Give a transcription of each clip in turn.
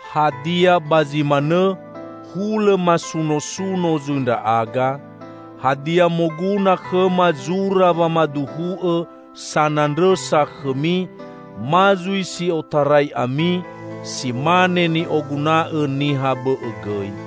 Hadia ba zi manõ hulõ masunosuno zui ndra'aga? Hadia moguna khõma zura wamaduhu'õ sanandrõsa khõmi, ma zui si otarai ami, si mane ni'oguna'õ niha bõ'õ gõi.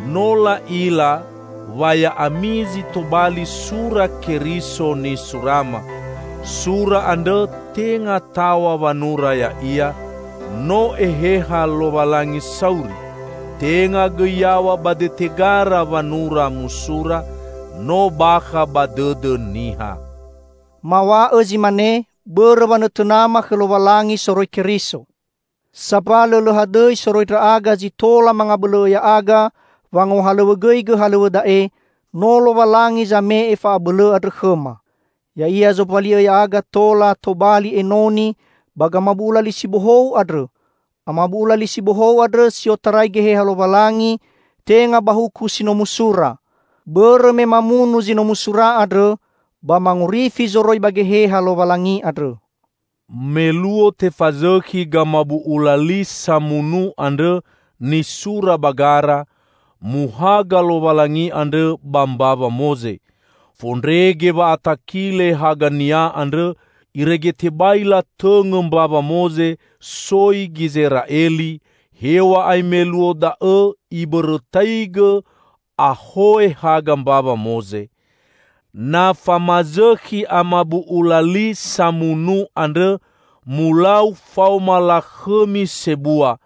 No la'ila wa ya'ami zi tobali sura Keriso nisurama, sura andrõ tenga taw̃a wanura ya'ia, no Eheha Lowalangi sauri; tenga gõi yaw̃a ba dete gara wanura musura, no bakha ba dõdõ niha. Maw̃a'õ zi mane, bõrõ wanõtõnama khõ Lowalangi soroi Keriso. Sambalõ lõ hadõi soroi ndra'aga zi tola mangabõlõ'õ ya'aga wangohalõwõgõigõ halõw̃õ da'e, no Lowalangi zame'e fa'abõlõ andrõ khõma. Ya'ia zombali'õ ya'aga tola tobali enoni ba gamabu'ula li si bohou andrõ; amabu'ula li si bohou andrõ si otarai Geheha Lowalangi, tenga ba huku si no musura. Bõrõ me mamunu zi no musura andrõ, ba mangorifi zoroi ba Geheha Lowalangi andrõ. Me luo tefazõkhi gamabu'ula li samunu andrõ nisura ba gara, muhaga Lowalangi andrõ ba mbawa Moze. Fondrege wa'atakile haga-Nia andrõ irege tebai latõngõ mbawa Moze soi Gizera'eli, hew̃a'ae me luo da'õ ibõrõtaigõ ahoe haga mbawa Moze. Na famazõkhi amabu'ula li samunu andrõ mulau faoma lakhõmi sebua,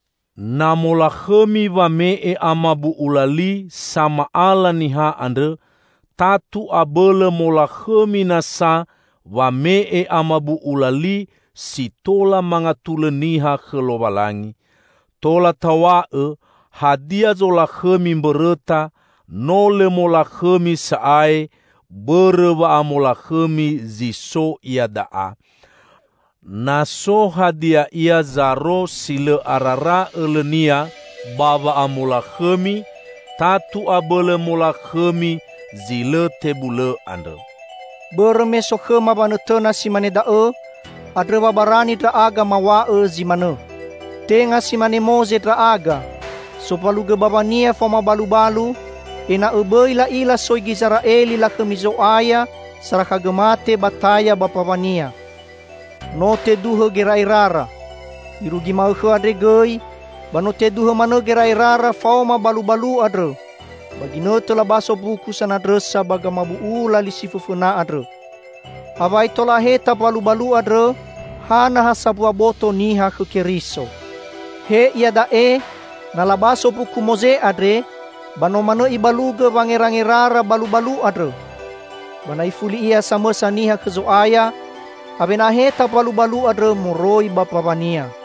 Na molakhõmi wame'e amabu'ula li sama'ala niha andrõ, tatu abõlõ molakhõmi nasa wame'e amabu'ula li si tola mangatulõ niha khõ Lowalangi. Tola taw̃a'õ, hadia zolakhõmi mbõrõta, no lõ molakhõmi sa'ae bõrõ wa'amolakhõmi zi so iada'a. Na so hadia ia zaro si lõ arara õlõnia ba wa'amolakhõmi, tatu abõlõ molakhõmi zi lõ tebulõ andrõ. Bõrõ me so khõma wanõtõna si mane da'õ, andrõ wa barani ndra'aga maw̃a'õ zi manõ. Tenga si mane Moze ndra'aga sombalugõ bawania faoma balubalu, ena'õ bõi la'ila soi Gizera'eli lakhõmi Zo'aya sarakhagõ mate ba taya ba mbawania. No teduhõ gera'erara. Irugi ma'õkhõ andre gõi ba no teduhõ manõ wangerangerara faoma balubalu andrõ ba ginõtõ labaso mbuku sanandrõsa ba gamabu'ula li si fõfõna andrõ. Awai tola aheta mbalubalu andrõ ha na ha sambua boto niha khõ Keriso. He iada'e, na labaso mbuku Moze andre, ba no manõ ibalugõ wangerangerara balubalu andrõ. Ba na ifuli ia samõsa niha khõ Zo'aya, awena aheta mbalubalu andrõ moroi ba mbawania.